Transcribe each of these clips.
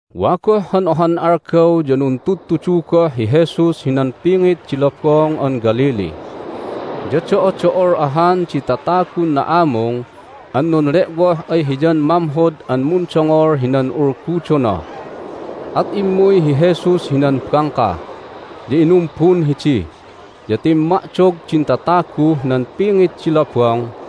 Wa goh han ohan algaw ya nuntudtudu goh hi Jesus hinan pingit di Lobong an Galilee. Ya do'odo'ol ahan di tatagun na'amung an nunle'woh ay Hiyan mamhod an mundongol hinan ulgudona, at immuy hi Jesus hinan bangka, ya inumbun hidi. Ya timma'dog din tataguh nan pingit di lobong.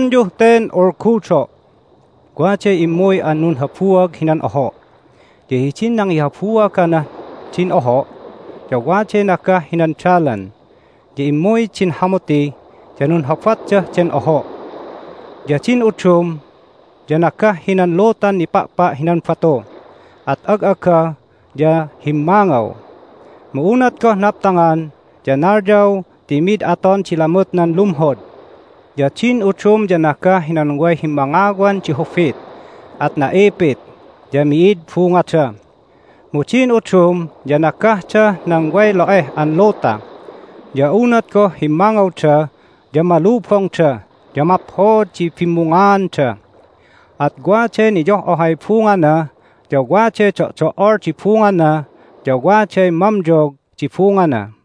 At inalinay, "Donglonyuh ten ulgudo': Waday immuy an nunhabuag hinan oho'. Ya hidin nangihabuagnah din oho' ya waday nagah hinan dalan, ya immuy din hamuti, ya nunhobatdah den oho'. Ya din udum ya nagah hinan lutan nipa'pa' hinan batu, at ag'aga ya himmangaw. Mu unat goh naptangan ya nalyaw ti mid aton di lamutnan lumhod. Ya din udum ya nagah hinan way himmangawan di hubit, at na'ipit, ya mi'id bungada. Mu din udum ya nagahdah nan way lo'eh an luta. Ya unat goh himmangawda ya malubongda, ya maphod di bimmungaanda. At waday niyoh'ohay bungana, ya waday do'do'ol di bungana, ya waday mamyog di bungana."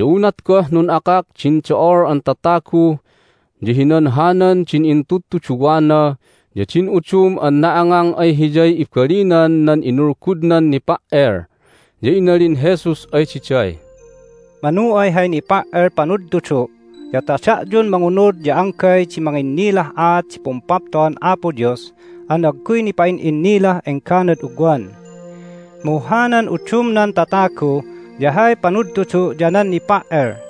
Ya unat goh nun'akak din do'ol an tatagu ya hinanhanan din intudtuduwana ya din udum an na'angang ay Hiyay ibalinan nan inulgudnan nipa"el. Ya inalin Jesus ay diday, "Manu ay hay nipa"el panudtudu' ya ta da'yun mangunud ya anggay di manginnilah aat di Pumpapto'an Apo Dios an agguy nipa'in'innilah engganad ugwan. Mu hanan udumnan tatagu ya hay panudtudu' ya nan nipa"el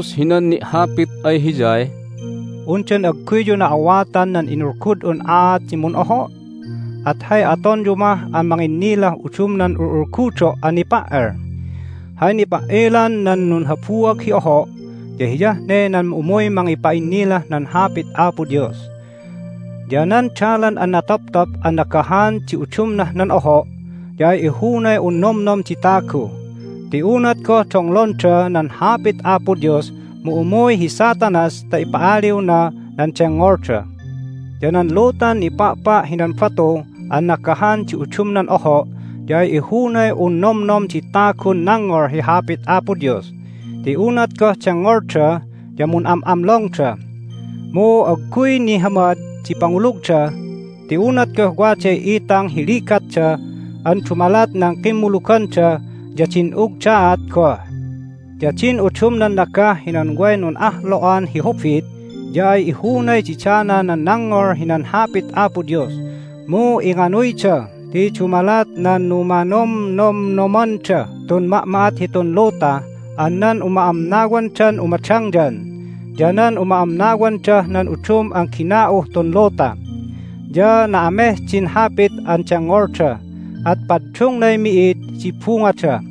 Inalin Jesus hinan ni'hapit ay Hiyay, "Undan agguyyu na'awatan nan inulgud'un aat di mun'oho'? At hay atonyu mah an manginnilah udumnan ul'ulgudo' an nipa"el? Hay nipa"elan nan nunhabuag hi oho' ya hiyah ne nan umuy mangipa'innilah nan Hapit Apo Dios. Ya nan dalan an natoptop an nagahan di udumnah nan oho' ya ay ihunay un nomnom di tagu. Ti unat goh donglonda nan Hapit Apo Dios mu umuy hi Satanas ta ipa'aliwna nan dengngolda. Ya nan lutan nipa'pa' hinan batu an nagahan di udumnan oho' ya ay ihunay un nomnom di tagun nangngol hi Hapit Apo Dios ti unat goh dengngolda ya mun'am'amlongda. Mu agguy nihamad di pangulugda ti unat goh waday itang hi ligatda an dumalat nan kimmuluganda ya din'ugdaat goh. Ya din udumnan nagah hinan way nun'ahlo'an hi hubit ya ay ihunay didana nan nangngol hinan Hapit Apo Dios, mu inganuyda ti dumalat nan numanomnomnomandah tun ma'ma'at hitun luta an nan uma'amnawandan umadangyan, ya nan uma'amnawandah nan udum an gina'uh tun luta, ya na'ameh din Hapit an dengngolda, at paddungnay mi'id di bungada.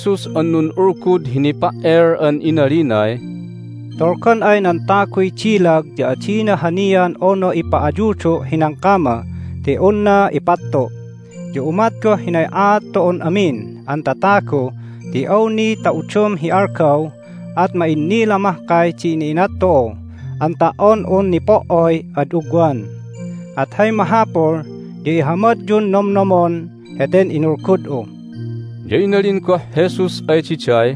Intuluy Jesus an nun'ulgud hi nipa"el an inalinay, "Tolgan ay nan taguy dilag ya adina hanian unu ipa'ayudu' hinan kama ti unna ipattu'. Ya umat goh hinay aat tu'un amin an tatagu ti awni ta udum hi algaw at ma'innila mahkay di ina'inat tu'u an ta"on un nipo"oy ad ugwan. At hay mahapul ya ihamadyun nomnomon heten inulgud'u!" Ya inalin goh Jesus ay diday,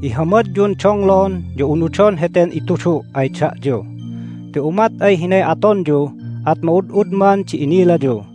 "Ihamadyun donglon ya unudon heten itudu' ay da'yu, ti umat ay hinay atonyu at ma'ud'udman di inilayu.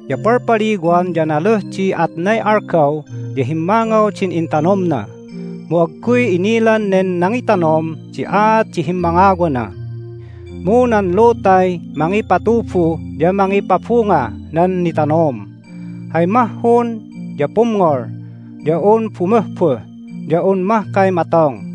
Ya palpaliwan ya naluh di atnay algaw ya himmangaw din intanomna. Mu agguy inilan nen nangitanom di aat di himmangawana. Mu nan lutay mangipatubu ya mangipabungah nan nitanom. Hay mahhun ya pumngol, ya un bumuhbuh, ya un mahkay matong.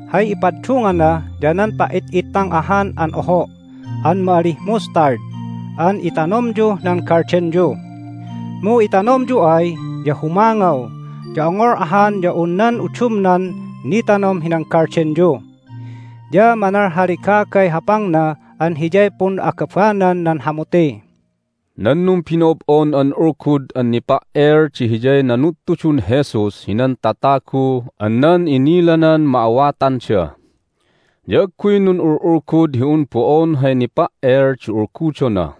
Hay ipaddungana ya nan pa"it'ittang ahan an oho' an ma'alih mustard an itanomyuh nan galdenyu. Mu itanomyu ay ya humangaw, ya ongol ahan ya un nan udumnan nitanom hinan galdenyu. Ya manalhalegagay hapangna an hiyay pun'agabanan nan hamuti." Nan numbino'ob'on an ulgud an nipa"el di hiyay nanudtudun Jesus hinan tatagu an nan inilanan ma'awatanda. Ya agguy nun'ul'ulgud hi un bo'on hay nipa"el di ulgudona,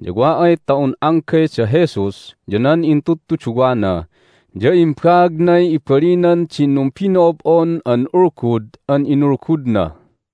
ya wa ay ta un anggay da Jesus ya nan intudtuduwana ya imbaagnay ibalinan din numbino'ob'on an ulgud an inulgudna.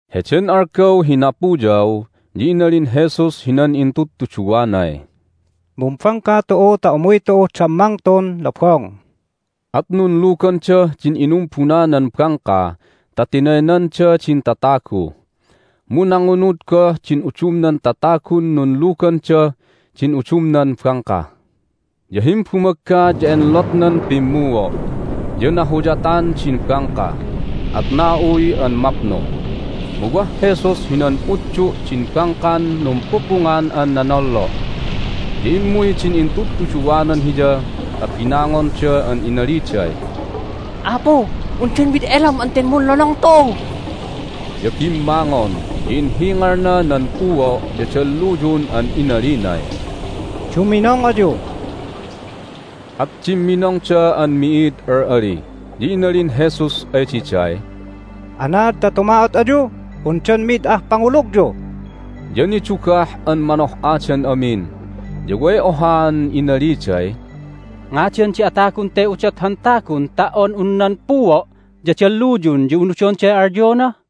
Heden algaw hi napuyaw ya inalin Jesus hinan intudtuduwanay, "Mumbangka tu'u ta umuy tu'uh dammang tun lobong." At nunlugandah din inumbunanan bangka ta tinaynanda din tatagu. Mu nangunud goh din udumnan tatagun nunlugandah din udumnan bangka. Ya himbumagga ya enlotnan pimmuo', ya nahuyatan din bangka, at na'uy an mapnu. Mu wah Jesus hinan utdu' din bangkan numpupungan an nonollo'. Ya immuy din intudtuduwanan Hiya ta binangonda an inaliday, "Apu, undan mid elam an ten munlonong tu'u?" Ya bimmangon, ya inhingalna nan puo' ya dalluyun an inalinay, "Duminong ayu!" At dimminongda an mi'id al'ali. Ya inalin Jesus ay diday, "Anaad ta tuma'ot ayu? Undan mi'id ah pangulugyu?" Ya nidugah an manoh'adan amin, ya way ohaan inaliday, "Ngadan di atagun te udot han tagun ta"on un nan puo' ya dalluyun ya unudonday alyona?"